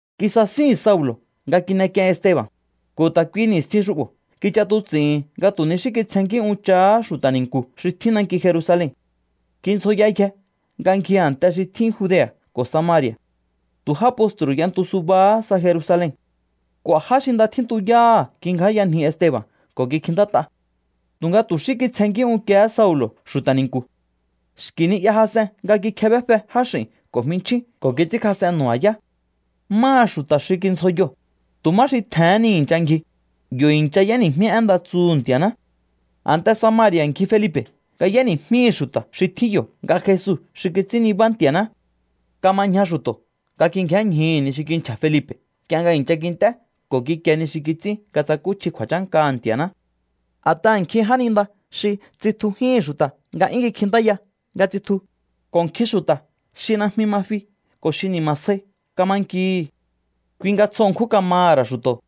Kisasíhi̱n Saulo̱ nga kin'ek'ien Esteba̱n, ko̱ ta̱ kuihi ni̱stjin xu'bo̱ kich'atuts'i̱hi̱n nga tu̱ ni xí kitsjennkí unchahá xu̱ta̱ ni̱nku̱ xi tjín nanki Jerusalen. Kindzjoyayje nga ngji a̱nte xi tjín Judea̱ ko̱ Samari̱a̱. Tu̱ já postru̱ y'entu subahá sa Jerusalen. K'u̱a̱ já xi nda tjíntuyáha̱ kingjáyanji Esteba̱n ko̱ kikjintát'a. Tu̱nga tu̱ xí kitsjenkí unkiehé Saulo̱ xu̱ta̱ ni̱nku̱. Xki̱ ni'ya jas'en nga kikjebéfe jáx'i̱n ko̱ jminchjín ko̱ kits'ínkjas'en nu̱ba̱yá. Máha xu̱ta̱ xi kindzjoyoo̱, tu̱ má xi tje̱hén ni nga i̱ncha ngji, yo̱ i̱ncha y'éni̱jmí én nda tsuhu̱ Nti̱a̱ná. A̱nte Samari̱a̱ ngji Felipe̱ nga y'éni̱jmíhi̱ xu̱ta̱ xi tjín yo̱ nga Jesu xi kits'ín nibá Nti̱a̱ná. Kama ñja xu̱to̱ nga kingjénñjuhu̱ ni xi kinchja̱ Felipe̱ nk'ie nga i̱ncha kint'é ko̱ kikie ni xi kits'ín nga tsakúchji kju̱a̱chánkaha̱ Nti̱a̱ná. A̱t'aha̱ nkjin jáninda xi tsitjujíhi̱n xu̱ta̱ nga 'yún kikjintáya nga tsitju, ko̱ nkjin xu̱ta̱ xi najmi ma fi ko̱ xi ni̱ma̱ sjai kama nkihi̱. Kui nga tsjo ṉkjún kamaha̱ ra̱ xu̱to̱.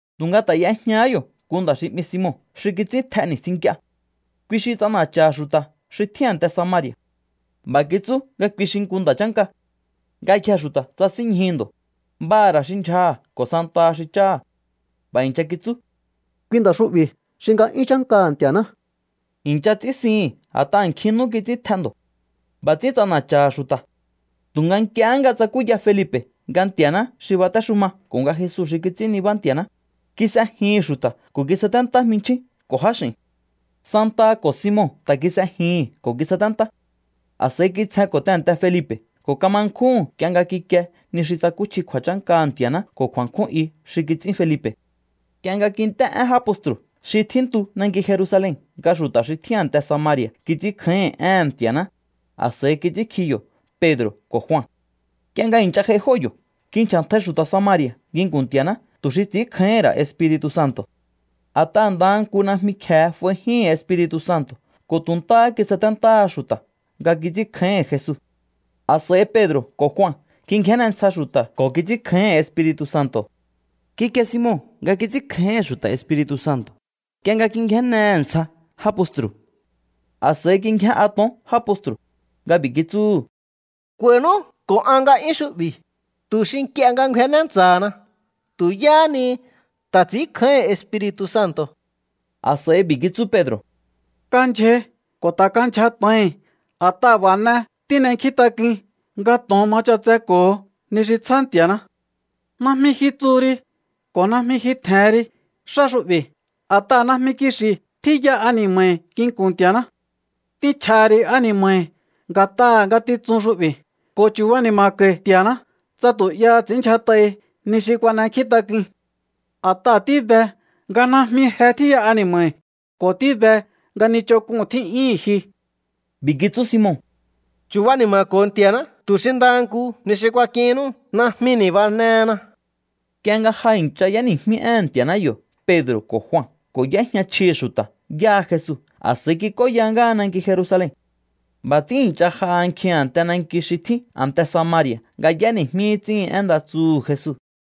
Tu̱nga ta̱ y'ejñahá yo̱ nku nda̱ xi 'mi Simon xi kits'ín tj'e ni̱stjin nk'ie. Kui xi ts'ana̱cha̱ha̱ xu̱ta̱ xi tjín a̱nte Samari̱a̱. B'a̱ kitsú nga kui xi nku nda̱ chánka. Ngayjee̱ xu̱ta̱ tsasínñjuhu̱ ndo̱, b'aha̱ ra̱ xi ndyjaha̱ ko̱ santaha xi cháha̱. B'a̱ i̱ncha kitsú: —Kui nda̱ xu'bi̱ xi nga'yún chánkaha̱ Nti̱a̱ná. I̱ncha ts'ínsihi̱n a̱t'aha̱ nkjin nú kits'ín tj'e ndo̱. B'a̱ ts'ín ts'ana̱cha̱ha̱ xu̱ta̱. Tu̱nga nk'ie nga tsakúya Felipe̱ nga Nti̱a̱ná xi batéxuma ko̱ nga Jesu xi kits'ín nibá Nti̱a̱ná, kis'ejihi̱n xu̱ta̱ ko̱ kisaténtá jmichjín ko̱ jáx'i̱n. Santaha ko̱ Simon ta̱ kis'ejihi̱n ko̱ kisaténtá. A̱s'a̱i kitsjenko̱ tehe̱nte Felipe̱ ko̱ kama nkjúhu̱n nk'ie nga kikie ni xi tsakúchji kju̱a̱chánkaha̱ Nti̱a̱ná ko̱ kju̱a̱nkjún i xi kits'ín Felipe̱. Nk'ie nga kint'é én já postru̱ xi tjíntu nanki Jerusalen nga xu̱ta̱ xi tjín a̱nte Samari̱a̱ kits'ínkjáíhi̱n éhe̱n Nti̱a̱ná, a̱s'a̱i kits'ínkji yo̱ Pedro̱ ko̱ Jua. Nk'ie nga i̱ncha j'ai jóo̱ yo̱, kinchja̱ntjai xu̱ta̱ Samari̱a̱ nginku̱n Nti̱a̱ná tu̱ xi ts'i̱ínkjáíhi̱n ra̱ Espiri̱tu̱ Santo̱. A̱t'aha̱ ndaha nku najmi kje̱e f'aijíhi̱n Espiri̱tu̱ Santo̱ ko̱ tu̱ ntáhá kisaténtáhá xu̱ta̱ nga kits'ínkjáíhi̱n Jesu. A̱s'a̱i Pedro̱ ko̱ Jua kingjénne ntsja xu̱ta̱ ko̱ kits'ínkjáíhi̱n Espiri̱tu̱ Santo̱. Kikie Simon nga kits'ínkjáíhi̱n xu̱ta̱ Espiri̱tu̱ Santo̱ nk'ie nga kingjénnehe̱ ntsja já postru̱. A̱s'a̱i kingjén'a to̱on já postru̱ nga b'i̱ kitsúhu̱: —K'u̱a̱i̱nú ko̱ an nga'yún xu'bi̱, tu̱ xi nk'ie nga ngjuenné ntsa̱hana tu̱ yáha ni ta̱ ts'i̱ínkjáíhi̱n Espiri̱tu̱ Santo̱. A̱s'a̱i b'i̱ kitsú Pedro̱: —Kandyjai ko̱ ta̱ kandyja tjo̱ohi̱n, a̱t'aha̱ b'a̱ n'e tín'enkjíntak'uin nga to̱on ma ch'atseko̱ho ni xi tsjá Nti̱a̱ná. Najmi ji tsuhu ri ko̱ najmi ji tje̱hen ri xá xu'bi̱, a̱t'aha̱ najmi kixi̱ tjíya ani̱ma̱hi̱ nginku̱n Nti̱a̱ná. T'inchj'a̱ha̱ ri̱ ani̱ma̱hi̱ nga̱t'aha̱ ngatitsun xu'bi̱ ko̱ chu̱bani̱ma̱ko̱i̱ Nti̱a̱ná, tsa tu̱ 'yaha ts'i̱ínndyjat'ahi ni xi kuan'enkjíntak'uin. A̱t'aha̱ tíbe nga najmi je tjíya ani̱ma̱hi̱ ko̱ tíbe nga ni ch'onk'uu̱n tjí'yíhi̱n ji. B'i̱ kitsú Simon: —Chu̱bani̱ma̱ko̱o Nti̱a̱ná tu̱ xi ndaha nku ni xi kuak'ihinnú najmi ni̱banehena. Nk'ie nga ja i̱ncha y'éni̱jmí éhe̱n Nti̱a̱ná yo̱ Pedro̱ ko̱ Jua ko̱ y'éjña chjihi̱ xu̱ta̱ yáha Jesu, a̱s'a̱i kik'óya ngáha nanki Jerusalen. B'a̱ ts'ín i̱ncha j'aha nkjin a̱nte nanki xi tjín a̱nte Samari̱a̱ nga y'éni̱jmí ts'íhin én nda tsuhu̱ Jesu.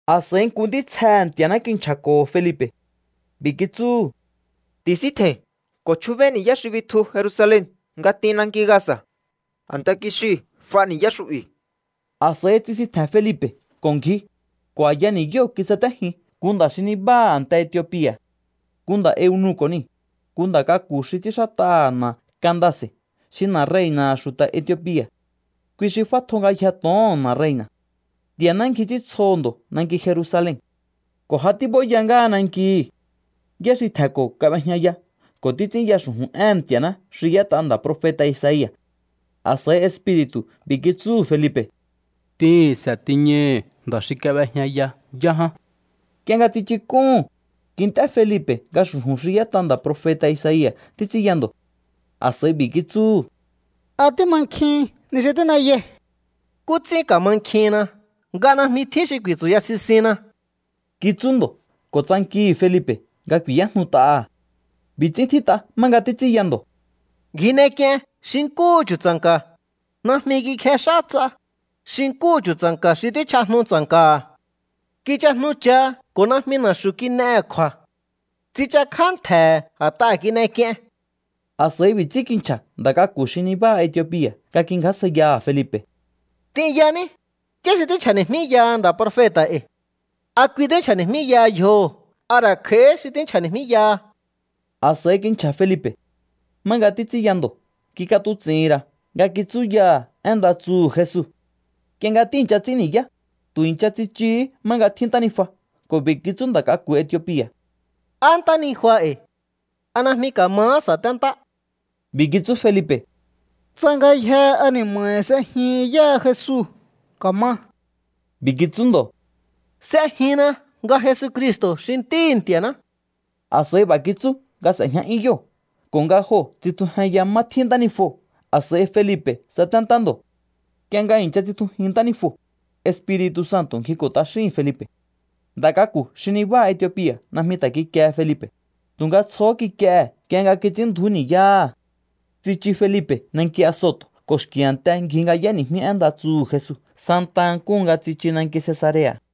A̱s'a̱i nku ntítsjehe̱ Nti̱a̱ná kinchja̱ko̱ho̱ Felipe̱. B'i̱ kitsúhu̱: —Ti̱síntje̱i̱n ko̱ chjúbéí ni̱yá xi bitju Jerusalen nga t'in nanki Gaza̱. A̱nte kixiu̱ f'a ni̱yá xu'bi̱. A̱s'a̱i tsisintje̱n Felipe̱ ko̱ ngji, ko̱ a̱ya ni̱yóo̱ kisatéjin nku nda̱ xi nibáha a̱nte Etiopia̱. Nku nda̱ eunuko̱ niu̱, nku nda̱ k'aku̱ xi ts'ínxát'aha̱ na̱ Candace̱ xi na̱ rei̱na̱ha̱ xu̱ta̱ Etiopia̱. Kui xi f'átjo ngayjee̱ to̱oho̱n na̱ rei̱na̱. Nti̱a̱ná ngji ts'íntsjoho̱ ndo̱ nanki Jerusalen ko̱ ja tíb'óya ngáha nankihi̱. Yá xi tje̱nko̱ kab'ejñaya ko̱ títs'ínya xu̱ju̱n éhe̱n Nti̱a̱ná xi y'ét'a nda̱ profeta̱ Isaia̱. A̱s'a̱i Espiri̱tu̱ b'i̱ kitsúhu̱ Felipe̱: —T'ihi̱nse̱ tiñaihi̱ nda̱ xi kab'ejñaya yá ján. Nk'ie nga tsichuk'úhu̱n, kint'é Felipe̱ nga xu̱ju̱n xi y'ét'a nda̱ profeta̱ Isaia̱ títs'ínya ndo̱. A̱s'a̱i b'i̱ kitsúhu̱: —¿A tímankjihin ni xi tín'eyai? —¿Nkú ts'ín ka̱mankjihinna nga najmi tjín xi ku̱i̱tsu̱ya sisinna? —kitsú ndo̱ ko̱ tsankihi̱ Felipe̱ nga ku̱i̱yájnut'aha̱. B'i̱ ts'ín tjít'a má nga títs'ínya ndo̱: Ngji n'ek'ien xi nkúhu chu̱tsa̱nka̱, najmi kikjex'á ts'a, xi nkúhu chu̱tsa̱nka̱ xi tíchj'ajnu tsa̱nka̱ha̱. Kichajnucha ko̱ najmi na̱xu̱ kin'ehe̱ kju̱a̱. Tsichakjá ntje̱he̱ a̱t'aha̱ kin'ek'ien. A̱s'a̱i b'i̱ ts'ín kinchja̱ nda̱ k'aku̱ xi nibáha Etiopia̱ nga kingjásjaiyaha̱ Felipe̱: —T'inyaní, ¿yá xi tínchja̱ni̱jmíyaha nda̱ profeta̱ e̱i̱? ¿A kui tínchja̱ni̱jmíyaha yjoho̱ a ra̱ kj'a̱íhí xi tínchja̱ni̱jmíyaha? A̱s'a̱i kinchja̱ Felipe̱. Má nga títs'ínya ndo̱ kik'atuts'i̱hi̱n ra̱ nga kitsúyaha̱ én nda tsuhu̱ Jesu. Nk'ie nga tíi̱ncha ts'ín ni̱yá, tu̱ i̱ncha tsichuhú má nga tjín ntánijua ko̱ b'i̱ kitsú nda̱ k'aku̱ Etiopia̱: —Á ntánijua e̱i̱. ¿A najmi ka̱mahá sa̱téntá? B'i̱ kitsú Felipe̱: —Tsa ngayjee̱ ani̱ma̱hi̱ s'ejihin yáha Jesu, ka̱ma. B'i̱ kitsú ndo̱: —S'ejinna nga Jesucristo̱ xi Ntíhi̱ Nti̱a̱ná. A̱s'a̱i b'a̱ kitsú nga s'e̱jña'yún yóo̱ ko̱ nga joo̱ tsitjujenya má tíjña ntánijuo̱. A̱s'a̱i Felipe̱ tsaténtá ndo̱. Nk'ie nga i̱ncha tsitjujin ntánijuo̱, Espiri̱tu̱ Santo̱ ngjiko̱ t'axíhi̱n Felipe̱. Nda̱ k'aku̱ xi nabáha Etiopia̱ najmi ta̱ kikiehe Felipe̱, tu̱nga tsjohó kik'iehe̱ nk'ie nga kits'ínndju̱ú ni̱yáha̱. Tsichu Felipe̱ nanki Azoto̱ ko̱ xki̱ a̱nte ngji nga y'éni̱jmí én nda tsuhu̱ Jesu santaha nkúhu nga tsichu nanki Cesarea̱.